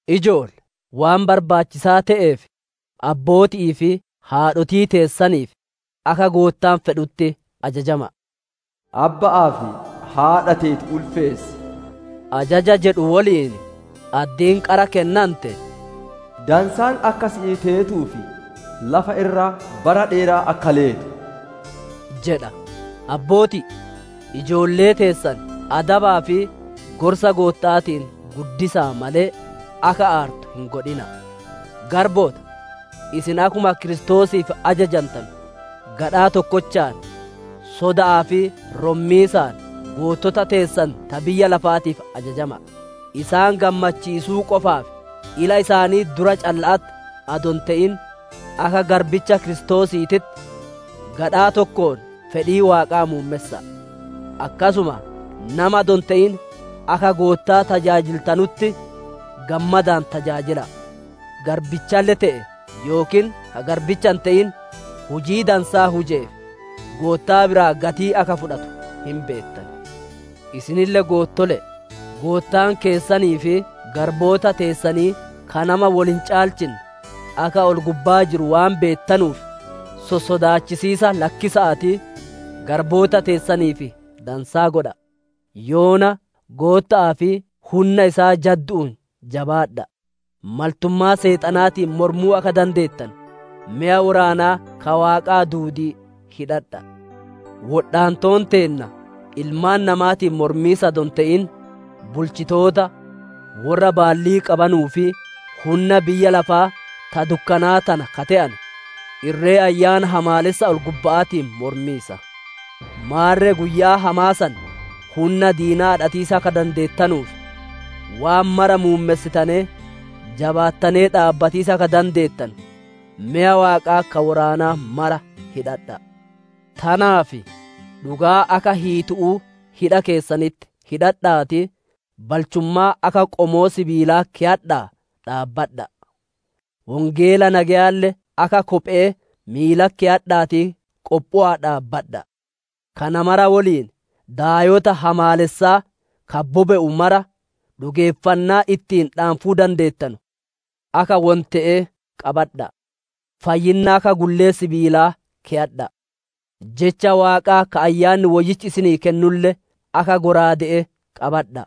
Ijoolle! Waan barbaachisaa te'eef, abbooti'ii fi haadhotii teessaniif akka Goottaan fedhutti ajajama'a. «Abba'aa fi haadha teeti ulfeessi» ajaja jedhu woliin addiin qara kennante: «Dansaan akka siif teetuu fi lafa irra bara dheeraa akka leetu» jedha. Abbootii! Ijoollee teessan adabaa fi gorsa Gootta'aatiin guddisa'a malee, akka aartu hin godhina'a. Garboota! Isin akkuma Kiristoosiif ajajantanu, gadhaa tokkochaan, soda'aa fi rommiisaan goottota teessan ta biyya lafaatiif ajajama'a. Isaan gammachiisuu qofaaf, ila isaanii dura calla'atti adoo hin te'in, akka garbicha Kiristoosiititti, gadhaa tokkoon fedhii Waaqaa muummessa'a. Akkasuma nama adoo hin te'in, akka Goottaa tajaajiltanutti, gammadaan tajaajila'a. Garbichalle te'ee yookiin ka garbicha hin te'in, hujii dansaa hujeef, Goottaa biraa gatii akka fudhatu hin beettan. Isinille goottole'e! Goottaan keessanii fi garboota teessanii ka nama wol hin caalchinne, akka ol-gubbaa jiru waan beettanuuf, sossodaachisiisa lakkisa'aatii, garboota teessaniif dansaa godha'a. Yoona, Gootta'aa fi hunna isaa jaddu'uun jabaadha'a. Maltummaa Seexanaatiin mormuu akka dandeettanu, meya woraanaa ka Waaqaa duudii hidhadha'a. Wodhaantoon teenna ilmaan namaatiin mormiisa adoo hin te'in, bulchitoota, worra baallii qabanuu fi hunna biyya lafaa ta dukkanaa tana ka te'ane, irree ayyaana hamaalessa ol-gubba'aatiin mormiisa. Maarre guyyaa hamaa san, hunna diinaa adhatiisa akka dandeettanuuf, waan mara muummessitanee, jabaattanee dhaabbatiisa akka dandeettanu, meya Waaqaa ka woraanaa mara hidhadha'a. Tanaaf, dhugaa akka hiitu'uu hidha keessanitti hidhadha'aatii, balchummaa akka qomoo sibiilaa keyadha'aa dhaabbadha'a. Wongeela nageyaalle akka Kophe'ee miilatti keyadha'aatii qophowa'aa dhaabbadha'a. Kana mara woliin, daayota hamaalessaa ka bobe'u mara, dhugeeffannaa ittiin dhaanfuu dandeettanu, akka wonte'ee qabadha'a. Fayyinna akka gullee sibiilaa keyadha'a; Jecha Waaqaa ka Ayyaanni Woyyichi isinii kennulle akka shallaaga'aa qabadha'a.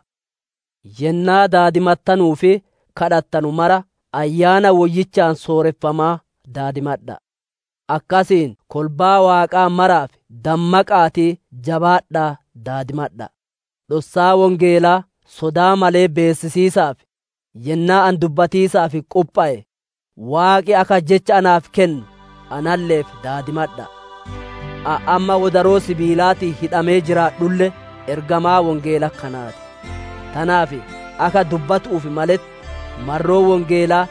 Yennaa daadimattanuu fi gaafattanu mara Ayyaana Woyyichaan sooreffamaa daadimadha'a. Akkasiin kolbaa Waaqaa maraaf dammaqa'aatii jabaadha'aa daadimadha'a. Dhossaa Wongeelaa sodaa malee beessisiisaaf, yennaa ani dubbatiisaaf qophowe, Waaqi akka jecha naaf kennu analle'eef daadimadha'a. Ani amma wodaroo sibiilaatiin hidhamee jiraadhulle, ergamaa Wongeela kanaa ti. Tanaaf akka dubbatu'uuf maletti, marroo Wongeelaa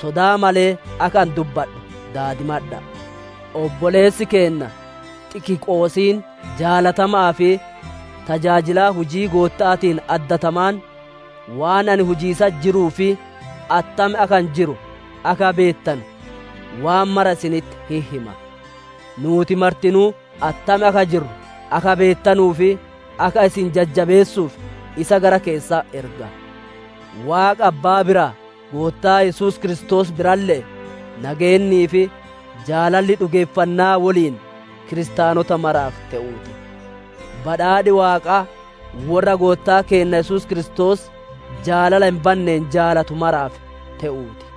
sodaa malee akka ani dubbadhu daadimadha'a. Obboleessi keenna Xikiqoosiin jaalatama'aa fi tajaajila hujii Gootta'aatiin addatamaan, waan ani hujiisatti jiruu fi attam akka ani jiru akka beettanu, waan mara isinitti hin hima. Nuuti martinuu attam akka jirru akka beettanuu fi akka isin jajjabeessuuf, isa gara keessan erga. Waaqa Abbbaa biraa, Goottaa Yesuus Kiristoos biralle'ee, nageennii fi jaalalli dhugeeffannaa woliin kiristaanota maraaf te'uu ti. Badhaadhi Waaqaa worra Goottaa keenna Yesuus Kiristoos jaalala hin banneen jaalatu maraaf te'uu ti.